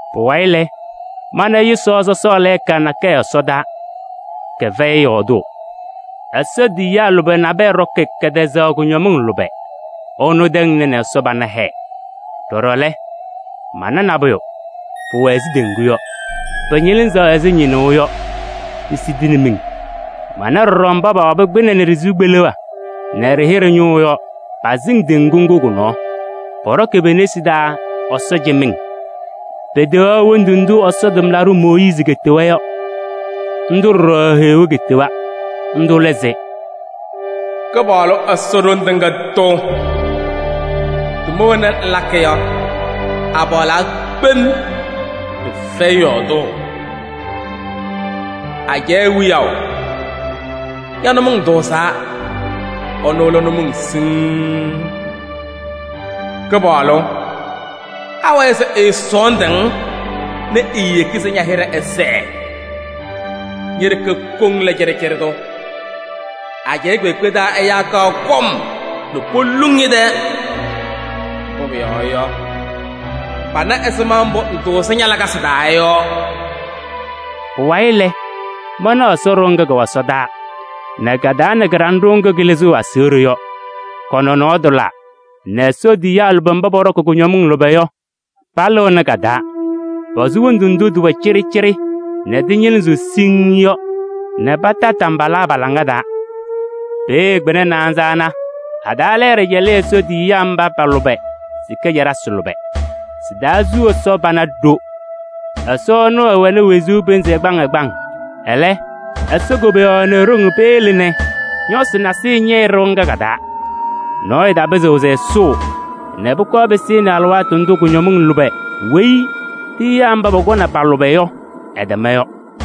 Pʋwayɩ lɛ, mana yʋsaɣ sɔsɔɔ lɛɛka nakɛyɛ ɛsɔdaa, kɛfɛyɩ yɔɔdʋʋ: Ɛsɔ tiyiyaa lʋbɛ nabɛyɛ ɖɔkɩ kɛtɛzaɣ kʋñɔmɩŋ lʋbɛ. Ɩnʋ tɛŋna nɛ Ɛsɔ pana hɛɛ. Ɖɔɖɔ lɛ, mana nabʋyʋ, pʋwɛ ɛzɩ teŋgu yɔ, pɩñɩlɩzɩɣ ɛzɩ ñɩnʋʋ yɔ, pisidini miŋ. Mana ɖɔɖɔ mba pawabɩ kpɩnɛ nɛ ɖɩ-sɩʋ kpeleɣ nɛ ɖɩ-hɩɖɛ ñʋʋ yɔ, pasɩŋ teŋgu ŋgʋ kʋ-nɔɔ. Pɔɖɔkɩ pe-nesi taa Ɛsɔ cɩmɩŋ. Peteɣaɣ hendu ndʋ Ɛsɔ tʋmlaɖʋ Mooyiizi ketewa yɔ. Ndʋ ɖɔɖɔ Heɣa ketewa. Ndʋ lɛ se: “Kɩpaɣlʋ Ɛsɔ, Ɖoŋ Tɩŋa Tʋ! Tʋma wena ŋlakɩ yɔ, apaɣlaa kpem, pɩfɛyɩ yɔɔdʋʋ! Ajɛɛ Wiyaʋ! Ña-nʋmɔŋ tʋʋzaa, ɩnʋ lɛ nʋmɔŋ siŋŋ. Kɩpaɣlʋ! Awɛɛ se ɛɛsɔɔndʋʋ-ŋ nɛ eeyeki se ña-hɩɖɛ ɛsɛɛ? Ñe-ɖeke koŋ lɛ cɩɖɩcɩɖɩ tʋ. Ajɛɛ kpeekpe taa ɛyaa kaɣ kɔm nɛ poluŋ ñɛ-tɛɛ, mbʋ pʋyɔɔ yɔ, pana ɛzɩma mbʋ ŋtʋʋzɩ ña-lakasɩ taa yɔ.” Pʋwayɩ lɛ, manaɣ Ɛsɔ ɖɩɣa ŋga kɛwɛ ɛsɔdaa nɛ ka-taa nɛ kɩɖanɖʋʋ ŋgʋ kɩlɩzɩɣ aseɣɖe yɔ, kɔ-nɔnɔɔ tʋlaa nɛ Ɛsɔ tiyiyaa lʋbɛ mba pɔɖɔkɩ kʋñɔmɩŋ lʋbɛ yɔ, palɩɣnɩ ka-taa. Posu wondu ndʋ tɩwɛ cɩɖɩcɩɖɩ nɛ tɩñɩlɩzɩɣ siŋŋ yɔ nɛ pata tambala pa-laŋa taa. Peeye kpɩna naanza ana a-taa lɛɛɖɛ cɛlɩ Ɛsɔ tiyiyaa mba pa-lʋbɛ sika caɖasɩ lʋbɛ. Sɩ-taa su Ɛsɔ pana ɖo. Ɛsɔ ɛnʋ ɛwɛnɩ wezuu pɩnzɩ ɛgbaŋ ɛgbaŋ. Ɛlɛ Ɛsɔ koboyaɣ nɛ e-ɖoŋ peyele nɛ ñɔsɩ nasɩyɩ ñɛyɩ ɖɩɣa ŋga ka-taa. Nɔɔyʋ tapɩzɩɣ se ɛsʋʋ nɛ pʋkɔɔ pɩsɩnɩ alɩwaatʋ ndʋ kʋñɔmɩŋ lʋbɛ weyi tiyiyaa mba pɔkɔnɩ pa-lʋbɛ yɔ, ɩtɛma yɔ.